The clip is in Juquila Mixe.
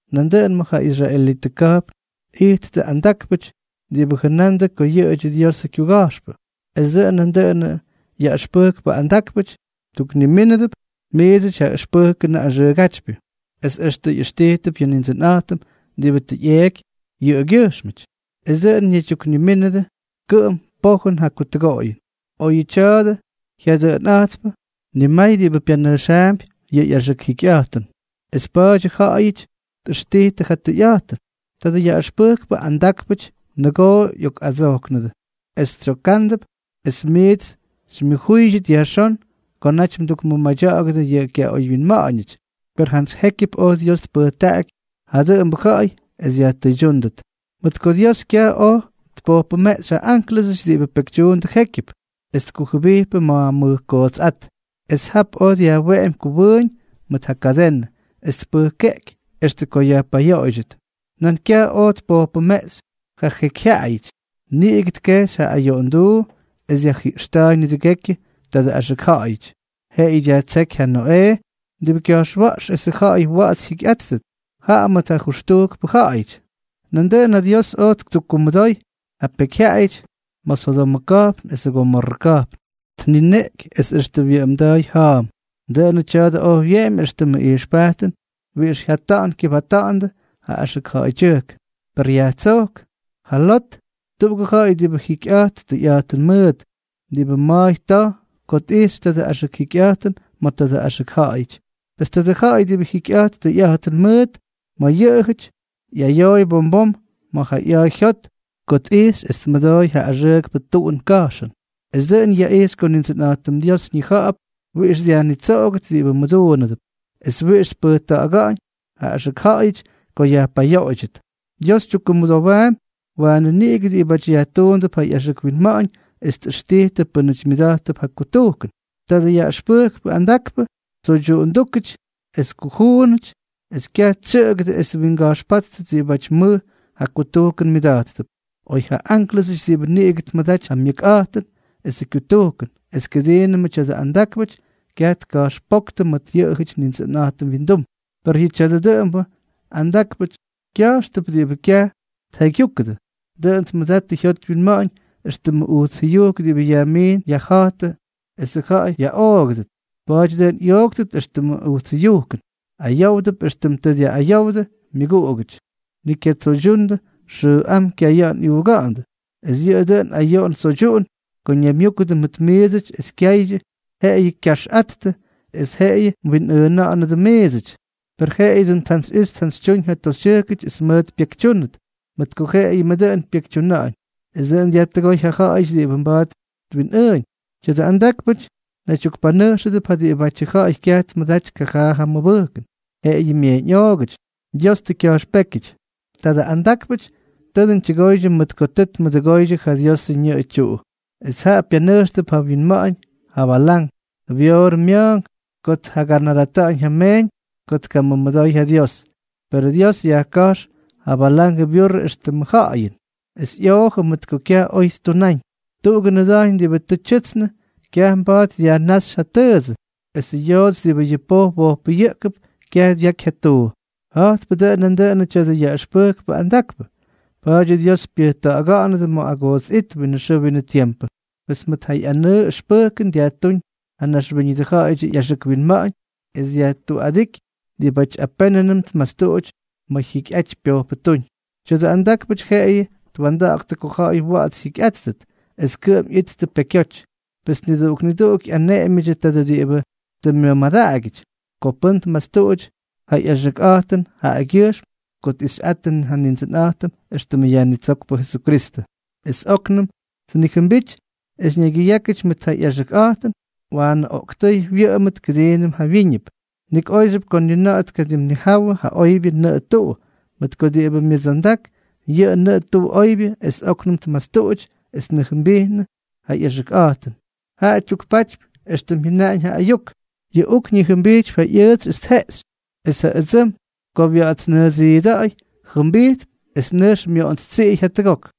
Nandʉꞌʉn ma̱ ja israelitʉ ka̱jpn ijttʉ andákpʉty diꞌibʉ jʉnandʉ ko yʉꞌʉdyʉ Diosʉ kyuga̱jxpʉ, es dʉꞌʉn nandʉꞌʉnʉ yaꞌʉxpʉjkpʉ andákpʉty mduknimínʉdʉp miidsʉty yʉ ʉxpʉjkʉnʉ axʉʉgátypyʉ. Es extʉ ꞌyʉxtijtʉp yʉ Nindsʉnꞌa̱jtʉm diꞌibʉ tʉ ꞌyeeky yʉꞌʉgyʉjxmʉty, es dʉꞌʉn ñaydyuknimínʉdʉ kʉꞌʉm pojʉn ja kutʉgoꞌoyʉn. Oyʉ tya̱a̱dʉ jyadʉꞌʉnꞌa̱jtpʉ, nimay diꞌibʉ pyanʉjxaampy yʉ ꞌyaxʉk jikyꞌa̱jtʉn, es pa̱a̱dyʉ ja̱ꞌa̱yʉty tꞌʉxtijtʉ ja tʉyꞌa̱jtʉn. Tadʉ yaꞌʉxpʉjkpʉ andákpʉty nʉgoo ꞌyokꞌadsojknʉdʉ, es tsyoka̱ꞌa̱ndʉp es miits xymyʉjúydyʉt yajxón ko naty mdukmʉmadya̱ꞌa̱gʉdʉ yʉ kyaꞌoywyinma̱ꞌa̱ñʉty; per jantsy jékyʉp oj Dios tpʉjtaꞌaky ja dʉꞌʉmbʉ ja̱ꞌa̱y es yajtʉydyúndʉt. Mʉt ko Dios kyaj oj tpojpʉmeꞌxy ja ánklʉsʉty diꞌibʉ pekytyuundʉ jékyʉp, es tkujʉbijpʉ ma̱ mʉj kootsꞌát, es jap oj dyajweꞌemy kʉwʉʉñ mʉt ja kadenʉ, es tpʉjkeꞌky extʉ ko yajpayoꞌoydyʉt. Nan kyaj Dios oj tpojpʉmeꞌxy ja jekyjyaꞌayʉty, niꞌigʉ tkejxy ja ayoꞌonduu es dyajjiꞌxta̱a̱y nidʉgekyʉ tadʉ axʉk ja̱ꞌa̱yʉty, jeꞌeyʉ dyajtséky ja Noꞌee, diꞌibʉ kya̱jxwa̱ꞌx esʉ ja̱ꞌa̱y wa̱ꞌa̱ts jyikyꞌáttʉt, jaꞌa mʉt nijʉxtujkpʉ ja̱ꞌa̱yʉty. Nandʉꞌʉn ja Dios oj ttukkumʉdoy ja pekyjyaꞌayʉty ma̱ Sodomʉ ka̱jpn esʉ Gomorrʉ ka̱jpn, tnineꞌky es extʉ wyʉꞌʉmda̱a̱y ja̱a̱m. Dʉꞌʉnʉ tya̱a̱dʉ oj wyeꞌemy éxtʉmʉ ijxpajtʉn wiꞌix jya̱ꞌta̱ꞌa̱n kyʉbata̱ꞌa̱ndʉ ja axʉk ja̱ꞌa̱ydyʉjk; per yajtsók ja Lot, tuꞌugʉ ja̱ꞌa̱y diꞌibʉ jikyꞌa̱jt tʉyꞌa̱jtʉn mʉʉt, diꞌibʉ ma̱a̱y ta̱j ko tꞌijxy tadʉ axʉk jikyꞌa̱jtʉn ma̱ tadʉ axʉk ja̱ꞌa̱yʉty. Pes tadʉ ja̱ꞌa̱y diꞌibʉ jikyꞌa̱jt tʉyꞌa̱jtʉn mʉʉt ma̱ yʉꞌʉjʉty, ꞌyayooy bom bom ma̱ ja ꞌya̱a̱ jyot ko tꞌijxy es tmʉdooy ja axʉʉkpʉ tuꞌun ka̱jxʉn. Es dʉꞌʉn yaꞌixy ko Nindsʉnꞌa̱jtʉm Dios ñija̱ꞌa̱p wiꞌix dyajnitsoꞌogʉt diꞌibʉ mʉduunʉp, es wiꞌix tpʉjkʉꞌʉga̱ꞌa̱ñ ja axʉk ja̱ꞌa̱yʉty ko yajpayoꞌoydyʉt. Dios tyukkumʉdowaampy waanʉ niꞌigʉ diꞌibáty yajtuundʉp ja ꞌyaxʉk winma̱ꞌa̱ñ es tꞌʉxtijtʉ pʉ́nʉty myʉda̱jttʉp ja kutujkʉn. Tadʉ yaꞌʉxpʉjkpʉ andakpʉ, tsoydyuꞌundúkʉty es kujuunʉty, es kyaj tsyʉꞌʉgʉdʉ es twinga̱jxpáttʉt diꞌibáty mʉj ja kutujkʉn myʉda̱jttʉp. Oy ja ánklʉsʉty diꞌibʉ niꞌigʉ tmʉdaty ja myʉkꞌa̱jtʉn esʉ kyutujkʉn es kʉdiinʉmʉ tya̱dʉ andákpʉty, kyaj tka̱jxpóktʉ mʉt yʉꞌʉjʉty Nindsʉnꞌa̱jtʉm wyindum. Per yʉ tya̱a̱dʉ dʉꞌʉmbʉ andákpʉty kya̱jxtʉp diꞌibʉ kyaj tjaygyúkʉdʉ, dʉꞌʉn tmʉdattʉ jyot wyinma̱ꞌa̱ñ éxtʉmʉ ujts jʉyujk diꞌibʉ ꞌyamiꞌin ꞌyaja̱jtʉ es ja ja̱ꞌa̱y yaꞌoogʉdʉt. Pa̱a̱ty dʉꞌʉn ꞌyooktʉt éxtʉmʉ ujts jʉyujkʉn, ayówdʉp éxtʉm tʉ dyaꞌꞌayowdʉ myʉguꞌugʉty. Ni kyatsoydyundʉ xʉʉꞌám kyaya̱ꞌa̱n ꞌyuuga̱ꞌa̱ndʉ. Es yʉꞌʉ dʉn ayoꞌon tsoydyuꞌun ko ñaymyúkʉdʉ mʉt miidsʉty es kyaydyʉ, jeꞌeyʉ kyaxꞌattʉ, es jeꞌeyʉ mwinꞌʉʉna̱ꞌa̱nʉdʉ miidsʉty. Per jeꞌeyʉ dʉꞌʉn tjantsyꞌixy tjantsytyúñ ja toxytyʉjkʉty es mʉʉt pyekytyúnʉt, mʉt ko jeꞌeyʉmʉ dʉꞌʉn pyekytyuna̱ꞌa̱ñ. Es dʉꞌʉn dyajtʉgóy ja ja̱ꞌa̱yʉty diꞌibʉ mba̱a̱t twinꞌʉʉñ. Tya̱dʉ andákpʉty naydyukpanʉjxʉdʉp ja diꞌibátyʉ ja̱ꞌa̱y kyaj tmʉdaty kajaa ja myʉbʉjkʉn. Jeꞌeyʉ myeeñꞌoogʉty. Dios tʉ kya̱jxpékyʉty. Tadʉ andákpʉty tʉ dʉn tyʉgoydyʉ mʉt ko tʉ tmʉduꞌudʉgóydyʉ ja Diosʉ ñʉꞌʉ tyuꞌu, es jaꞌa pyanʉjxtʉp ja wyinma̱ꞌa̱ñ ja Balán, Beorʉ mya̱a̱nk, ko tjaganaratáñ ja meeñ ko tkamʉmʉdooy ja Dios. Perʉ Dios yajka̱jx ja Balangʉ byurrʉ éxtʉmʉ ja̱ꞌa̱yʉn, es ꞌyoojʉ mʉt ko kyaj oy ttunáñ. Tuꞌugʉ nʉda̱jñ diꞌibʉ tʉ tyʉtsnʉ kyaj mba̱a̱t dyajnáxy ja tʉʉdsʉ, esʉ yoots diꞌibʉ yʉ poj wojpʉyʉꞌkʉp kyaj dyaky ja tuu; ja̱jtpʉ dʉꞌʉn nandʉꞌʉnʉ tya̱dʉ yaꞌʉxpʉjkpʉ andakpʉ, pa̱a̱dyʉ Dios pyʉjta̱ꞌa̱ga̱ꞌa̱nʉdʉ ma̱ agoots it winʉ xʉʉ winʉ tiempʉ. Pes mʉt ja ꞌyanʉʉ ʉxpʉjkʉn dyajtúñ ja naxwíñʉdʉ ja̱ꞌa̱yʉdyʉ ꞌyaxʉk winma̱ꞌa̱ñ, es dyajtuꞌadíky diꞌibʉty apénʉnʉm tmastuꞌuty ma̱ jyikyꞌaty pyojpʉtúñ. Tya̱dʉ andákpʉty jeꞌeyʉ twa̱nda̱ꞌa̱ktʉ ko ja̱ꞌa̱y wa̱ꞌa̱ts jyikyꞌáttʉt, es kʉꞌʉm ꞌyittʉ pekyoty. Pes niduꞌuk niduꞌuk ꞌyaneꞌemyʉdyʉ tadʉ diꞌibʉ tʉ myʉmadaꞌagyʉty. Ko pʉ́n tmastuꞌuty ja ꞌyaxʉkꞌa̱jtʉn jaꞌagyʉjxm ko tꞌixyꞌattʉ Nindsʉnꞌa̱jtʉm éxtʉmʉ Yajnitsókpʉ Jesukristʉ, es óknʉm tnijʉmbity es ñaygyʉyákyʉty mʉt ja ꞌyaxʉkꞌa̱jtʉn, waanʉ oꞌktʉ́y wyʉꞌʉmʉt kʉdiinʉm jawyíñʉp. Nik óyxyʉp ko ni na̱ꞌa̱ tkadimnijawʉ yʉ oybyʉ nʉꞌʉ tuꞌu, mʉt ko diꞌibʉ myʉdsondak yʉ nʉꞌʉ tuꞌu oybyʉ es óknʉm tmastuꞌuty es tnijʉmbijnʉ ja ꞌyaxʉkꞌa̱jtʉn, jaꞌa tyukpatypy éxtʉm jyʉnaꞌañ ja ayuk: “Yʉ uk ñijʉmbijtypy ja ꞌyʉʉtsy es tjeꞌxy”, es “ja ʉdsʉm ko wya̱ꞌa̱tsnʉʉdsiida̱ꞌa̱y, jʉmbijtp es nʉjx myoꞌontstsiꞌiy jatʉgok.”